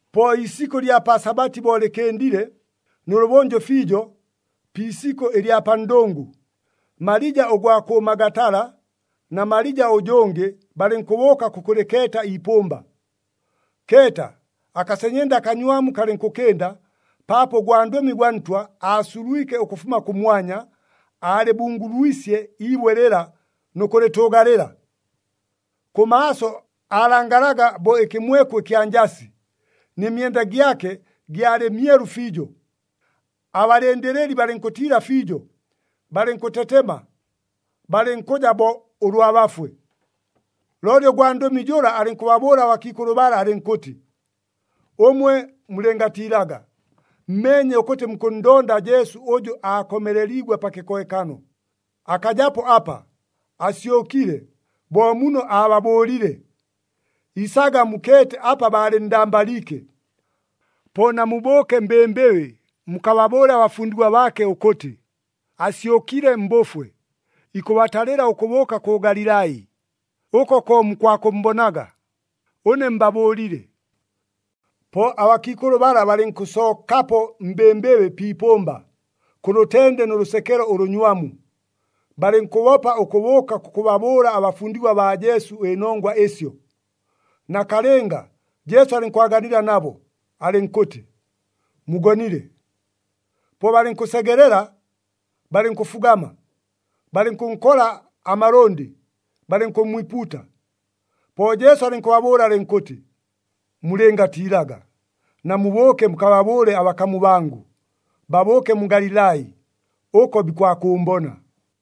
Po iisikʉ ɨlya pa Sabati bo lɨkɨndile, nʉlʉbʉnjʉ fiijo pi isikʉ ɨlya pa ndʉngʉ, Malija ʉgwa kʉ Magatala na Malija ʉjʉngɨ balɨnkʉbʉʉka kʉkʉlɨkeeta iipʉmba. Keeta, akasenyenda akanywamu kalɨnkʉkɨnda, paapo ʉgwandʉmi gwa Ntwa aasulwike ʉkʉfuma kʉmwanya, aalɨbungulwisye iibwe lɨla nʉ kʉlɨtʉʉgalɨla. Kʉmaaso aalangalaga bo ɨkɨmweku ɨkya njasi, nɨ myenda gyake gyalɨ myelu fiijo. Abalɨndɨlɨli balɨnkʉntiila fiijo, balɨnkʉtetema, balɨnkʉja bo ʉlwa bafwe. Looli ʉgwandʉmi jʉla alɨnkʉbabʉʉla abakiikʉlʉ bala alɨnkʉtɨ, “Ʉmwe mulɨngatiilaga! Mmeenye ʉkʉtɨ mukʉnndonda Jesu ʉjʉ aakomeleliigwe pa kɨkohekano. Akajapo apa! Asyʉkile, bo muno aababʉʉlile. Isaga mukeete apa baalɨnndambaliike. Po namubʉʉke mbɨmbɨbɨ mukababʉʉle abafundigwa baake ʉkʉtɨ, ‘Asyʉkile mbʉfwe, ikʉbatalɨla ʉkʉbʉʉka kʉ Galilai. Ʉko ko mukwakʉmmbonaga.’ Ʉne mbabʉʉlile!” Po abakiikʉlʉ bala balɨnkʉsookapo mbɨmbɨbɨ pi ipʉmba, kʉ lʉtende nʉ lʉsekelo ʉlʉnywamu. Balɨnkʉbopa ʉkʉbʉʉka kʉkʉbabʉʉla abafundigwa baa Jesu ɨnongwa ɨsyo. Nakalɨnga, Jesu alɨnkwaganila nabo, alɨnkʉtɨ, “Mugonile!” Po balɨnkʉsegelela, balɨnkʉfugama, balɨnkʉnkola amalʉndɨ, balɨnkʉmmwipuuta. Po Jesu alɨnkʉbabʉʉla alɨnkʉtɨ, “Mulɨngatiilaga. Namubʉʉke mukababʉʉle abakamu bangʉ, babʉʉke mu Galilai, ʉko bikwakʉʉmbona.”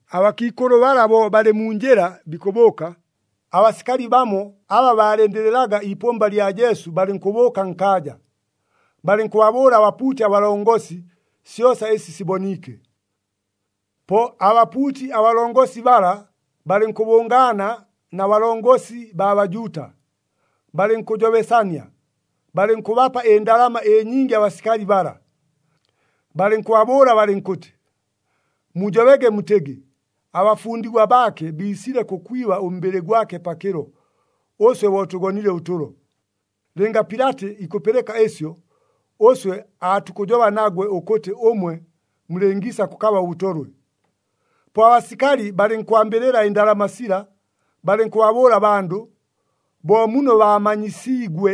Abakiikʉlʉ bala bo balɨ mu njɨla bikʉbʉʉka, abasikali bamo aba baalɨndɨlɨlaga iipʉmba lya Jesu balɨnkʉbʉʉka nkaaja, balɨnkʉbabʉʉla abapuuti abalongosi syosa ɨsi siboniike. Po abapuuti abalongosi bala balɨnkʉbʉngaana na balongosi baa Bajuuta, balɨnkʉjobesania, balɨnkʉbapa ɨndalama ɨnyingi abasikali bala. Balɨnkʉbabʉʉla balɨnkʉtɨ, “Mujobege mutɨgɨ, ‘Abafundigwa baake biisile kʉkwiba ʉmbɨlɨ gwake pakɨlo, ʉswe bo tʉgonile ʉtʉlo.’ Lɨnga Pilati ikʉpɨlɨka ɨsyo, ʉswe aatukʉjoba nagwe ʉkʉtɨ ʉmwe mulɨngiisa kʉkaba ʉbʉtolwe.” Po abasikali balɨnkwambɨlɨla ɨndalama sila, balɨnkʉbabʉʉla abandʉ bo muno baamanyisiigwe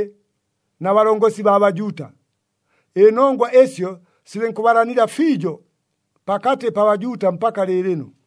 na balongosi baa Bajuuta. Ɨnongwa ɨsyo silɨnkʉbalanila fiijo pakatɨ pa Bajuuta mpaka lɨɨlɨno.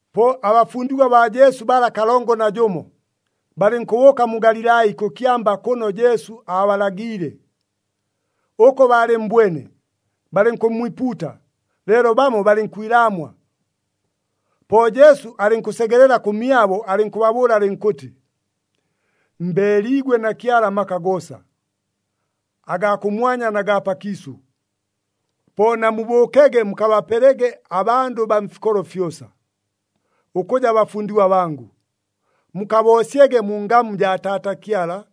Po abafundigwa baa Jesu bala kalongo na jʉmo, balɨnkʉbʉʉka mu Galilai kʉ kyamba kʉno Jesu aabalagiile. Ʉko baalɨmmbwene, balɨnkʉmmwipuuta, leelo bamo balɨnkwilaamwa. Po Jesu alɨnkʉsegelela kʉmyabo alɨnkʉbabʉʉla alɨnkʉtɨ, “Mbeeliigwe na Kyala amaka goosa, agaa kʉmwanya na gaa pakiisʉ. Po namubʉʉkege mukabapelege abandʉ baa mfikolo fyosa, ʉkʉja bafundigwa bangʉ. Mukaboosyege mu ngamu jaa Taata Kyala,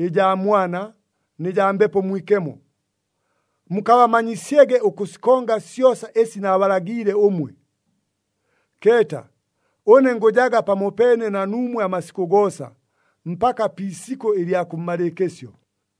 ɨjaa Mwana nɨ jaa Mbepo Mwikemo. Mukabamanyisyege ʉkʉsikonga syosa ɨsi naabalagiile ʉmwe. Keeta, ʉne ngʉjaga pamopeene na nuumwe amasikʉ goosa, mpaka pi isikʉ ɨlya kʉmmalɨɨkɨsyo.”